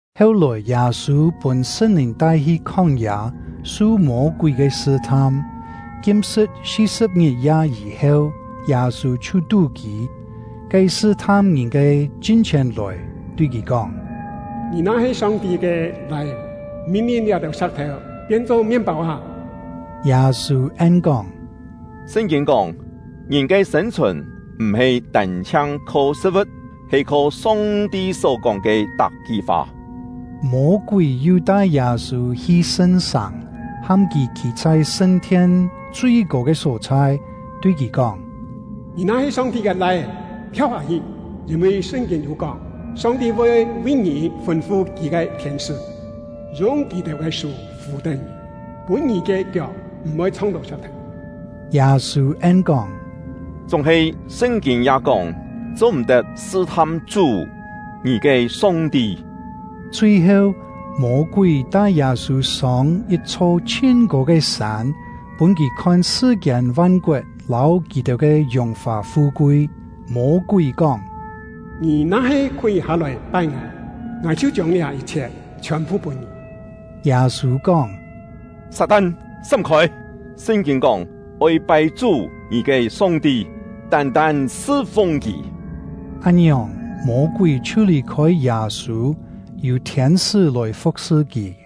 Heu-lòi, Yâ-sû pûn Sṳn-Lìn tai-hi khóng-yâ, su Mô-kúi ke sṳ-tham. Kim-sṳ̍t si-sṳ̍p ngit-ya yî-heu, Yâ-sû chhiu tú-kî. Ke sṳ-tham ngìn ke chin-chhièn lòi, tui kì kóng: “Ngì na-he Song-ti ke Lai-é, min-lin liá-têu sa̍k-thèu pien-cho mien-pâu â!” Yâ-sû en-kóng: “Sṳn-kîn kóng: ‘Ngìn ke sên-chhùn m̀-he tân-chhiang kho sṳ̍t-vu̍t, he kho Song-ti só-kóng ke tak-ki fa.’” Mô-kúi yu tai Yâ-sû hi Sṳn-sàng, ham kì khî chhai sṳn-thien chui-kô ke só-chhai, tui kì kóng: “Ngì na-he Song-ti ke Lai-é, thiau hâ-hi; yîn-vi Sṳn-kîn yû kóng: Song-ti voi vi ngì fûn-fu Kì ke thiên-sṳ́, yung kì-têu ke sú fù-tén ngì, pûn ngì ke kiok m̀-voi chhong-tó sa̍k-thèu.” Yâ-sû en-kóng: “Chúng-he Sṳn-kîn ya kóng: ‘Cho-m̀-tet sṳ-tham Chú — ngì ke Song-ti.’” Chui-heu, Mô-kúi tai Yâ-sû sông yit-chho chhin-kô ke sân, pûn kì khon sṳ-kiên van-koet lâu kì-têu ke yùng-fà fu-kui. Mô-kúi kóng: “Ngì na-he khúi hâ-lòi pai ngài, ngài chhiu chiông liá yit-chhiet chhiòn-phu pûn ngì.” Yâ-sû kóng: “Sat-tan, sám-khôi! Sṳn-kîn kóng: ‘Oi pai Chú — ngì ke Song-ti, tân-tân sṳ-fung Kì.’” Án-ngiòng, Mô-kúi chhiu lì-khôi Yâ-sû, yû thiên-sṳ́ lòi fu̍k-sṳ kì.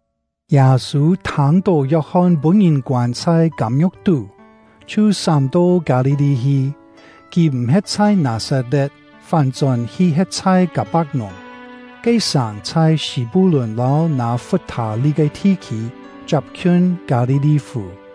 Yâ-sû thâng-tó Yok-hon pûn-ngìn koân chhai kâm-ngiu̍k tú, chhiu sám-to Kâ-li-li hi. Kì m̀ he̍t chhai Nâ-sat-le̍t, fán-chón hi he̍t chhai Kâ-pak-nùng. Ke sàng chhai Sî-pu-lùn lâu Nâ-fut-thâ-li ke thi-khî, chiap-khiun Kâ-li-li-fù.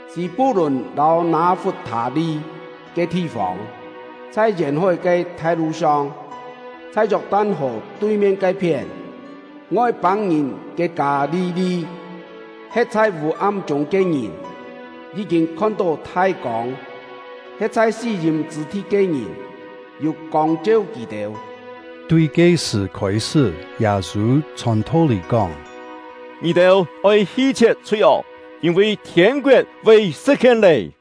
Sî-pu-lùn lâu Nâ-fut-thâ-li ke thi-fông, chhai yèn-hói ke thai-lu song, chhai Yok-tan-hò tui-mien ke-phién, Ngoi-pâng-ngìn ke Kâ-li-li! He̍t chhai vû-am chûng ke ngìn yí-kîn khon-tó thai kông; he̍t chhai sí-yîm chṳ̂ thi ke ngìn yû kông cheu kì-têu. Tui ke-sṳ̀ khôi-sṳ́, Yâ-sû chhòn tho-lî kóng: “Ngì-têu oi hi-chhie̍t chhui-ok, yîn-vi thiên-koet voi sṳ̍t-hien lé!”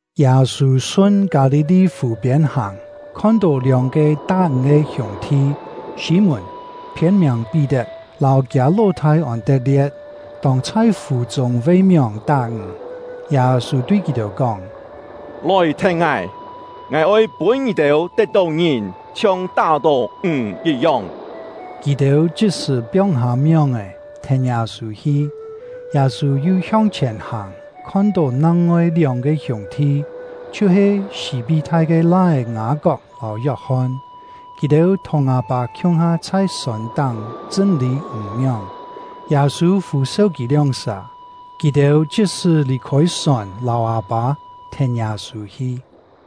Yâ-sû sun Kâ-li-li fù-piên hàng, khon-tó lióng-ke tá-ǹg ke hiûng-thi, Sî-mùn (phiên-miàng Pí-tet) lâu kiâ ló-thâi Ôn-tet-lie̍t, tông-chhai fù-chûng ve-mióng tá-ǹg. Yâ-sû tui kì-têu kóng: “Lòi thèn ngài! Ngài oi pûn ngì-têu tet-tó ngìn chhiong tá-tó ǹg yit-yong.” Kì-têu chit-sṳ̀ piong-hâ mióng-è, thèn Yâ-sû hi. Yâ-sû yu hiong-chhièn hàng, khon-tó nang-ngoi lióng-ke hiûng-thi, chhiu-he Sî-pí-thai ke lai-é Ngâ-kok lâu Yok-hon; kì-têu thùng â-pâ khiung-ha chhai sòn-táng chṳ́n-lî ǹg-mióng. Yâ-sû fû-seu kì lióng-sà, kì-têu chit-sṳ̀ lì-khôi sòn lâu â-pâ, thèn Yâ-sû hi.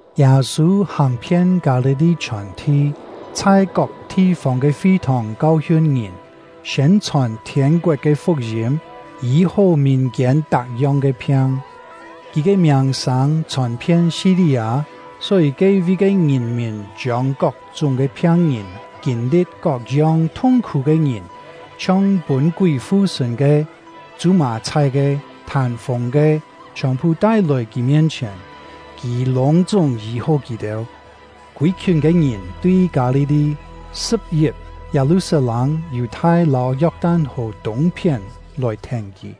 Yâ-sû hàng-phien Kâ-li-li chhiòn-thi, chhai kok thi-fông ke fi-thòng kau-hiun ngìn, siên-chhòn thiên-koet ke fuk-yîm, yî-hó mìn-kiên tak-yong ke phiang. Kì ke miàng-sâng chhòn-phien Si-li-â, só-yî ke-vi ke ngìn-mìn chiông kok-chúng ke phiang-ngìn, kîn-li̍t kok-yong thung-khú ke ngìn, chhiong pûn kúi fu-sṳ̂n ke, chû-mà-chhái ke, thân-fûng ke, chhiòn-phu tai-lòi kì mien-chhièn; kì lûng-chúng yî-hó kì-têu. Kûi-khiùn ke ngìn tui Kâ-li-li, Sṳ̍p-yip, Yâ-lu-sat-lâng, Yù-thai lâu Yok-tan-hò tûng-phién lòi thèn kì.